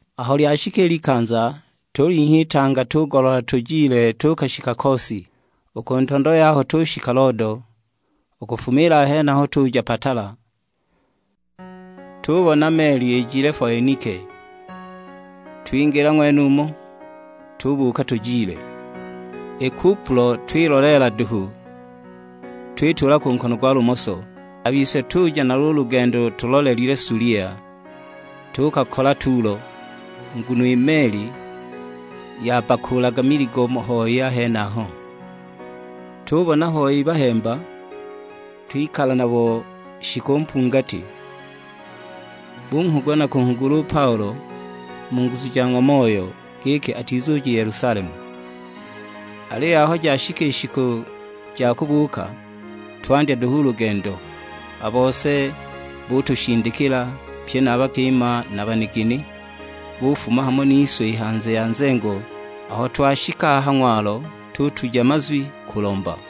Aho lyashika i likanza, tulinhya itanga tugoloola tujile tuukashika Kosi, u ku ntondo yaho tushika Lodo, u kufuma a henaho tuja Patala. Tubona meli ijile Foenike, twingila ng'wenumo, tubuuka tujile. I Kupulo twiloleela duhu, twitula ku nkono gwa lumoso, a bise tuja nalo u lugendo tulolile Sulia; tuukakola Tulo, nguno i meli yabbakuulaga miligo hoi a henaho. Tubona hoi bahemba, twikala nabo shiku mpungati; bunghugula na kunghugula u Paulo mu nguzu ja ng'wa Moyo, giki atizuja i Yelusalemu. Aliyo aho jashika i shiku ja kubuuka, twandya duhu u lugendo; a bose butushindikila, pye na a bakima na a banigini bufuma hamo nise i hanze ya nzengo; aho twashika a ha ng'walo tutuja mazwi kulomba.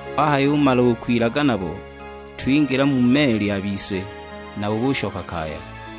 Twahayumala u kwilaga nabo, twingila mu meli a bise, nabo bushoka kaya.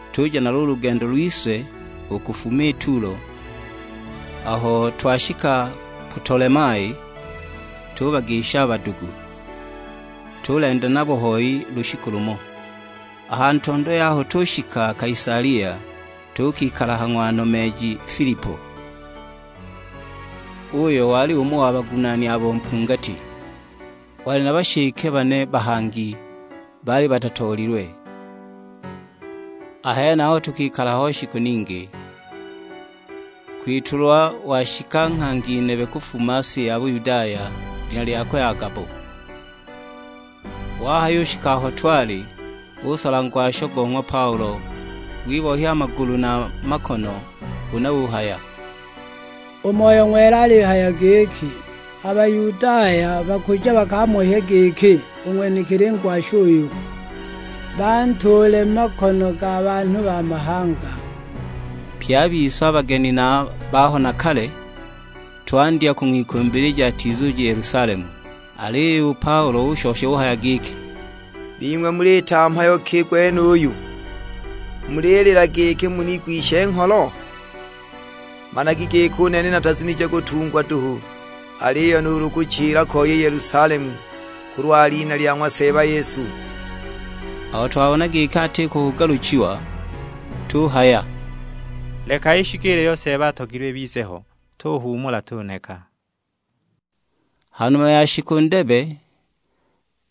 Tuja nalo u lugendo lwise u kufuma i Tulo, aho twashika Putolemai tubagisha a badugu, tulenda nabo hoi lushiku lumo. A ha ntondo yaho tushika Kaisalia, tuukikala ha ng'wa nomeeji Filipo, uyo wali umo wa bagunaani abo mpungati. Wali na bashike bane bahangi, baali batatoolilwe. A henaho tukikala ho shiku ningi, kwitulwa washika nghangi nebe kufuma si ya Buyudaya, lina lyakwe Agabo. Wahayushika aho twali, usola ngwasho go ng'wa Paulo, wibohya a magulu na a makono; huna uhaya, "U Moyo Ng'wela alihaya giki, 'A Bayudaya bakuja bakamohye giki u ng'wenekili ngwasho uyu, bantuule mu makono ga banhu ba mahanga.' " Pye a bise, a bageni na a baho na kale, twandya kung'wikumbilija atizuja i Yelusalemu. Aliyo u Paulo ushosha uhaya giki, "Bing'we muliita mhayo ki u gwenuyu, mulilila giki munigwishe ngholo? Managi giki u nene natazunije kutungwa duhu, aliyo nuulu kuchila ko i Yelusalemu, kulwa lina lya ng'wa Seeba Yesu!" Aho twabona giki atiko kugaluchiwa, tuhaya, "Leka ishikiile iyo Seeba atogilwe ibize ho; tuhuumula tuneka." Ha numa ya shiku ndebe,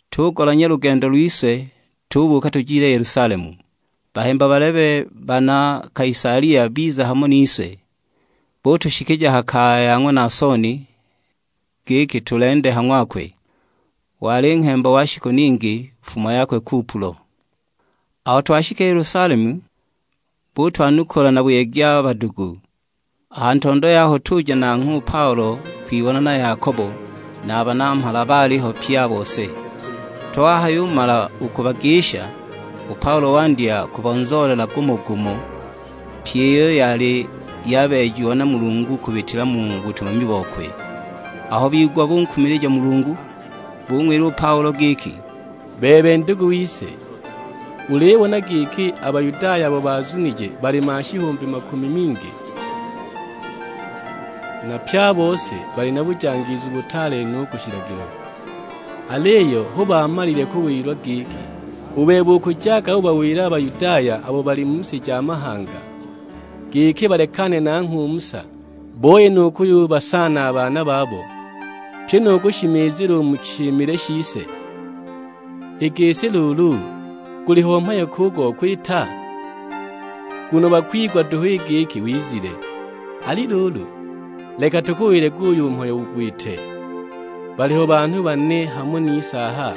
tugolanya lugendo lwise; tubuuka tujile Yelusalemu. Bahemba balebe bana Kaisalia biza hamo nise, butushikija ha kaya ya ng'wa Naasoni, giki tulende ha ng'wakwe. Wali nghemba wa shiku ningi, fumo yakwe Kupulo. Aho twashika i Yelusalemu, butwanukula na buyegi a badugu. A ha ntondo yaho tuja nanghwe u Paulo kwibona na Yakobo; na a banamhala baaliho pye a bose. Twahayumala u kubagisha, u Paulo wandya kubonzoolela gumo-gumo, pyi iyo yali yabeejiwa na Mulungu kubitila mu butumami bokwe. Aho bigwa bunkumilija Mulungu, bung'wila u Paulo giki, "Bebe ndugu wise, ulibona giki a Bayudaya abo baazunije bali mashihumbi makumi mingi; na pye a bose bali na bujangiizu butaale no u ku shilagilo! Aliyo hu baamalile kuwilwa giki, u bebe ukujaga ubawila a Bayudaya abo bali mu si ja mahanga, giki balekane nanghwe u Musa; booye nu kuyubasaala a baana babo, pyi nu kushimizila u mu shimile shise. I gisi luulu, guliho mhayo ki u go kwita? Nguno bakwigwa duhu i giki wizile! Ali luulu, leka tukuwile guyu mhayo ugwite; baliho banhu bane hamo nise aha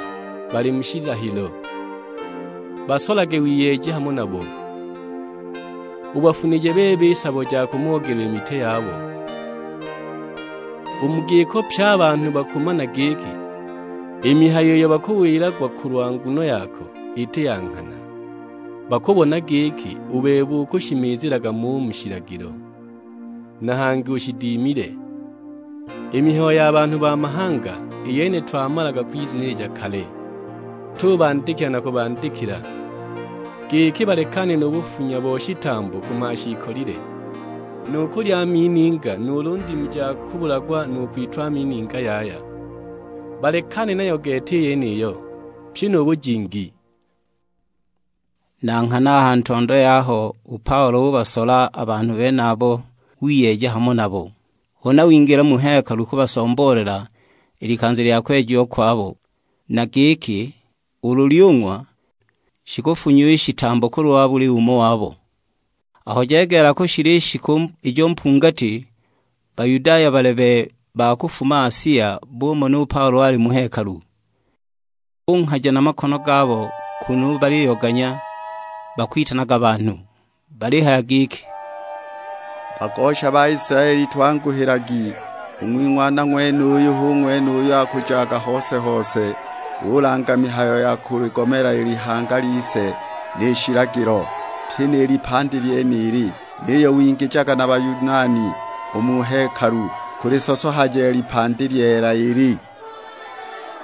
bali mu shilahilo. Basolage wiyeeje hamo nabo, ubafunije bebe i sabo ja kumoogelwa i mitwe yabo. U mu giko pye a banhu bakumana giki, i mihayo iyo bakuwilagwa kulwa nguno yako iti ya nghana; bakubona giki u bebe ukushimizilaga mo u mu shilagilo, na hangi ushidimile. I mihayo ya banhu ba mahanga i yene twamala kwizunilija kale, tubandikila na kubandikila, giki balekane nu bufunya bo shitambo ku mashiikolile, nu kulya a mininga nuulu ndimu ja kubulagwa na kwitwa mininga yaya; balekane nayo gete i yeniyo, pyi nu bujingi." Na nghana a ha ntondo yaho u Paulo ubasola a banhu benabo wiyeeja hamo nabo; huna wingila mu hekalu kubasomboolela i likanza lya kwejiwa kwabo; na giki ulu lyung'wa, shikufunyiwa i shitambo kulwa buli umo wabo. Aho jegeela kushila i shiku ijo mpungati, Bayudaya balebe, ba kufuma Asia, bumona u Paulo ali mu hekalu. Bunghaja na makono gabo kunu baliyoganya, bakwitanaga banhu. Balihaya giki, "Bagosha Baisilaeli twanguhilagi, u ng'wing'wana ng'wenuyu hu ng'wene uyo akujaga hose-hose, ulanga mihayo ya kuligomela i lihanga lise ni shilagilo; pyi ni lipandi lyenili. Niyo wingijaga na Bayunani u mu hekalu, kulisosohaja i lipandi lyeela ili!"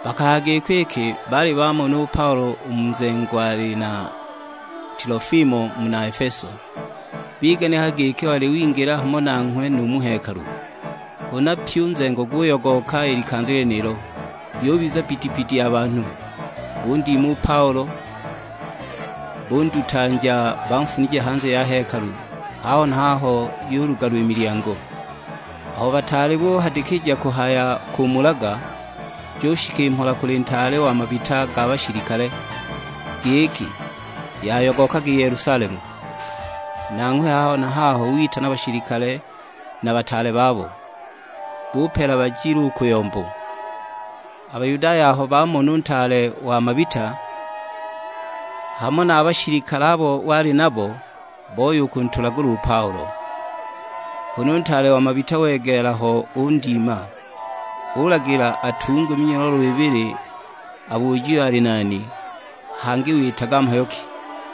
Bakahaya giko iki baali bamona u Paulo u mu nzengo ali na Tilofimo muna Efeso, biganikaga giki wali wingila hamo nanghwe nu mu hekalu. Huna pyi u nzengo guyogooka i likanza lyenilo; yubiza bbidibbidi a banhu. Bundima u Paulo, bundutanja banfunije hanze ya hekalu; haho na haho yulugalwa i milyango! Aho bataali buhadikija kuhaya kumulaga, jushika i mhola kuli ntaale wa mabita ga bashilikale, giki yayogooka i Yelusalemu. Nanghwe haho na haho witana bashilikale na bataale babo, bupeela bajile u ku yombo. A Bayudaya aho bamona u ntaale wa mabita, hamo na a bashilikale abo wali nabo, boya u kuntulagula u Paulo. Huna u ntaale wa mabita wegeela ho undima, ulagila atungwe minyololo ibili abujiwe ali nani, hangi witaga mhayo ki!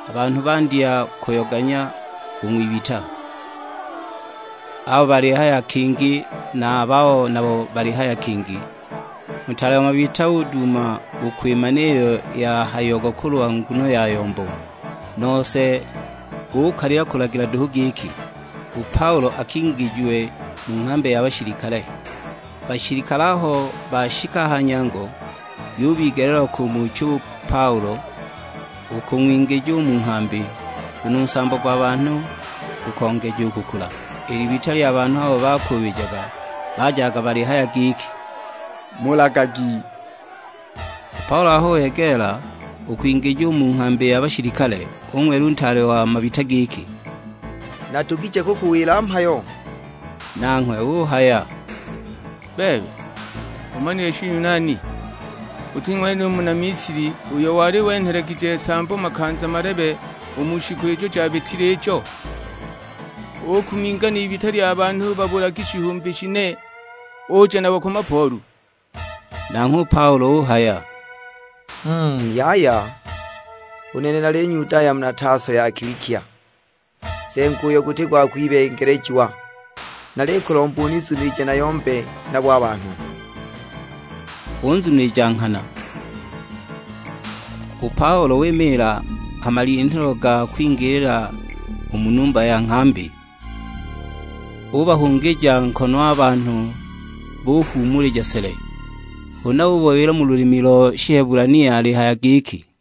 A banhu bandya kuyoganya u ng'wibita: abo balihaya kingi na a babo nabo balihaya kingi. U ntaale wa mabita uduuma u kwimana iyo yahayiagwa kulwa nguno ya yombo, nose ukalila kulagila duhu giki, u Paulo akingijiwe mu nghambi ya bashilikale. A bashilikale aho bashika a ha nyango, yubigeleelwa kumucha u Paulo, u kung'wingija u mu nghambi, nguno u nsambo gwa banhu gukongeja u kukula. I libita lya banhu abo bakuubijaga bajaga balihaya giki, "Mulagagi!" U Paulo aho wegeela u kwingijiwa u mu nghambi ya bashilikale, ung'wila u ntaale wa mabita giki, "Nadugije kukuwila mhayo?" Nanghwe uhaya, "Bebe, umanile Shiyunani? Uti ng'wene u muna Misili uyo wali wenhelegije nsambo makanza malebe u mu shiku ijo jabitile ijo, ukuminga n'ibita lya banhu babulagi shihumbi shine, uja nabo ku mapoolu?" Nanghwe u Paulo uhaya, "Mm yaya, u nene nali Nyudaya muna Taso ya Kilikia, nzengo uyo guti gwa kwibengelejiwa; nalikulomba unizunilije nayombe nabo a banhu." Unzunilija nghana. U Paulo wimiila ha malinhilo ga kwingilila u mu numba ya nghambi, ubahungija nkono a banhu buhuumulija sele. Huna ubawila mu lulimi lo Shihebulania alihaya giki,